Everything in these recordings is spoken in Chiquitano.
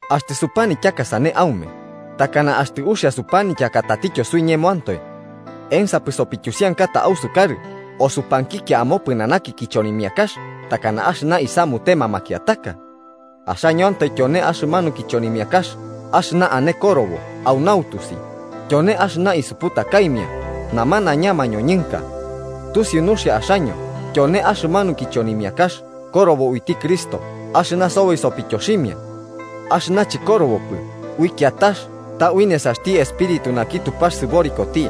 Axtɨ supanityaka sane, ¿aume takana axtɨ uxia supanityaka tatityo suiñemoantoe? ¿Ensapɨ sopityusiankata ausukarɨ o supankikia amopɨnanaki kichonimiakax takana axɨna isamutema makiataka? Axañoantoe tyone axɨmanu kichonimiakax axɨna ane korobo au nautusi tyone axɨna isuputakaimia namanaiña mañoñɨnka. Tusiu nuxia axaño tyone axɨmanu kichonimiakax korobo uiti Cristo axɨna soboi sopityoximia. Axɨna chɨkorobopɨ ui kiatax ta ui nesaxti Espíritu naki Tupax sɨborikoti.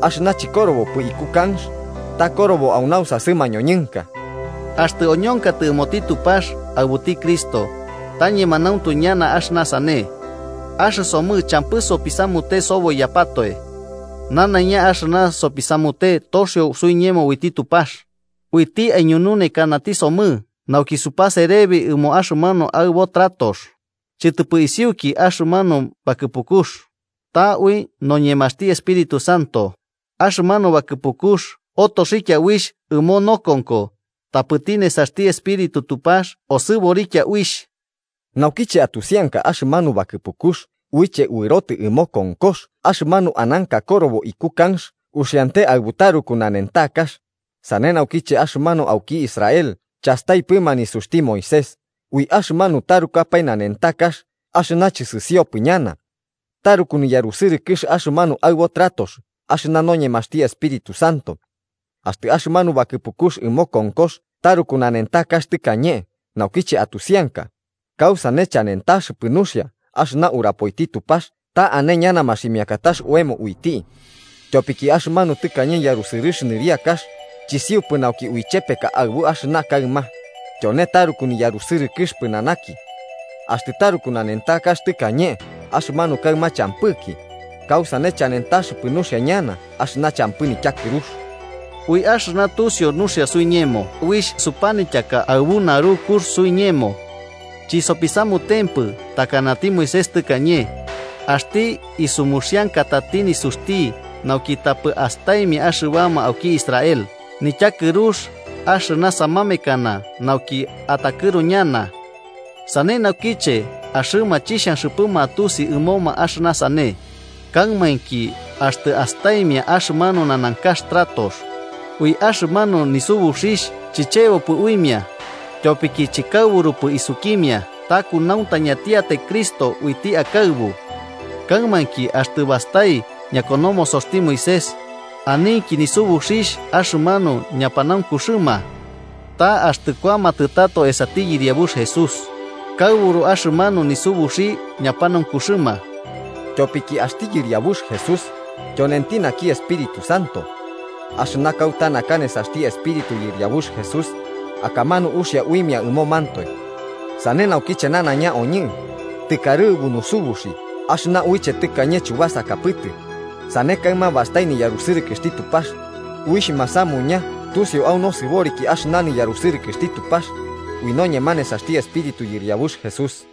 Axɨna chɨkorobopɨ iku kanx, ta korobo au nausasɨ mañoñɨnka. Axtɨ oñonkatɨ ɨmoti Tupax aɨbuti Cristo, ta ñemanauntu ñana axɨna sane. Axɨsomɨ champɨ sopisamute soboiyapatoe. Nanaiña axɨna sopisamute toxio suiñemo uiti Tupax, uiti aiñununekanati somɨ nauki supaserebi ɨmo axɨmanu aɨbo tratox, chɨtɨpɨ isiuki axɨmanu bakɨpukux, ta ui noñemaxti Espíritu Santo, axɨmanu bakɨpukux otoxikia uixh ɨmo nokonko tapɨti nesaxti Espíritu Tupax osɨborikia uixh. Naukiche atusianka axɨmanu bakɨpukux uiche uɨrotɨ ɨmo konkox axɨmanu ananka korobo iku kanx uxiante aɨbu taruku nanentakax, sane naukiche axɨmanuma auki Israel chastaipɨma nisuxti Moisés, ui axɨmanu tarukapae nanentakax axɨna chɨsɨsiopɨ ñana, ¡taruku niyarusɨrɨkɨx axɨmanu aɨbo tratox axɨna noñemaxti Espíritu Santo! Axtɨ axɨmanu bakɨpukux ɨmo konkox taruku nanentakax tɨkañe naukiche atusianka, ¡kausane chanentaxɨpɨ nuxia axɨna urapoiti Tupax ta ane ñana maximiakatax oemo uiti! Tyopiki axɨmanu tɨkañe yarusɨrɨx nɨriakax chisiupɨ nauki uichepeka aɨbu axɨna kaɨma, tyone taruku niyarusɨrɨkɨx pɨnanaki. Axtɨ taruku nanentakax tɨkañe axɨmanu kaɨma champɨki, kausane chanentaxɨpɨ nuxia ñana axɨna champɨ nityakɨrux. Ui axɨna tusiu nuxia suiñemo uixh supanityaka aɨbu narukux suiñemo. Chisopisamutempɨ takanati Moisés tɨkañe, axti isumuxiankatati nisuxti nauki tapɨ astaimia axɨbama auki Israel nityakɨrux axɨna samamekana nauki atakɨru ñana. Sane naukiche axɨma chixhanxɨpɨma atusi ɨmoma axɨna sane, kaɨmainki axtɨ astaimia axɨmanu nanankax tratox, ui axɨmanu nisubuxixh chiyebopɨ uimia, tyopiki chɨkarɨbupɨ isukimia ta kunauntañatiatai Cristo uiti akaɨbu. Kaɨmainki, axtɨ bastai ñakonomosoxti Moisés, aninki nisubuxixh axɨmanu ñapanaunkuxɨma. Ta axtɨ kuamatɨ tato esati Yɨriabux Jesús, kaɨburu axɨmanu nisubuxi ñapanaunkuxɨma. Tyopiki axti Yɨriabux Jesús tyonenti naki Espíritu Santo. Axɨna kauta naka nesaxti Espíritu Yɨriabux Jesús, akamanu uxia uimia ɨmomantoe. Sane naukiche nanaiña oñɨ, tɨkarɨbu nusubuxi axɨna uiche tɨkañe chubasakapɨtɨ, sane kaɨma bastai niyarusɨrɨkɨxti Tupax, uixh masamuña tusiu au nosɨboriki axɨna niyarusɨrɨkɨxtti Tupax, ui noñema nesaxti Espíritu Yɨriabux Jesús.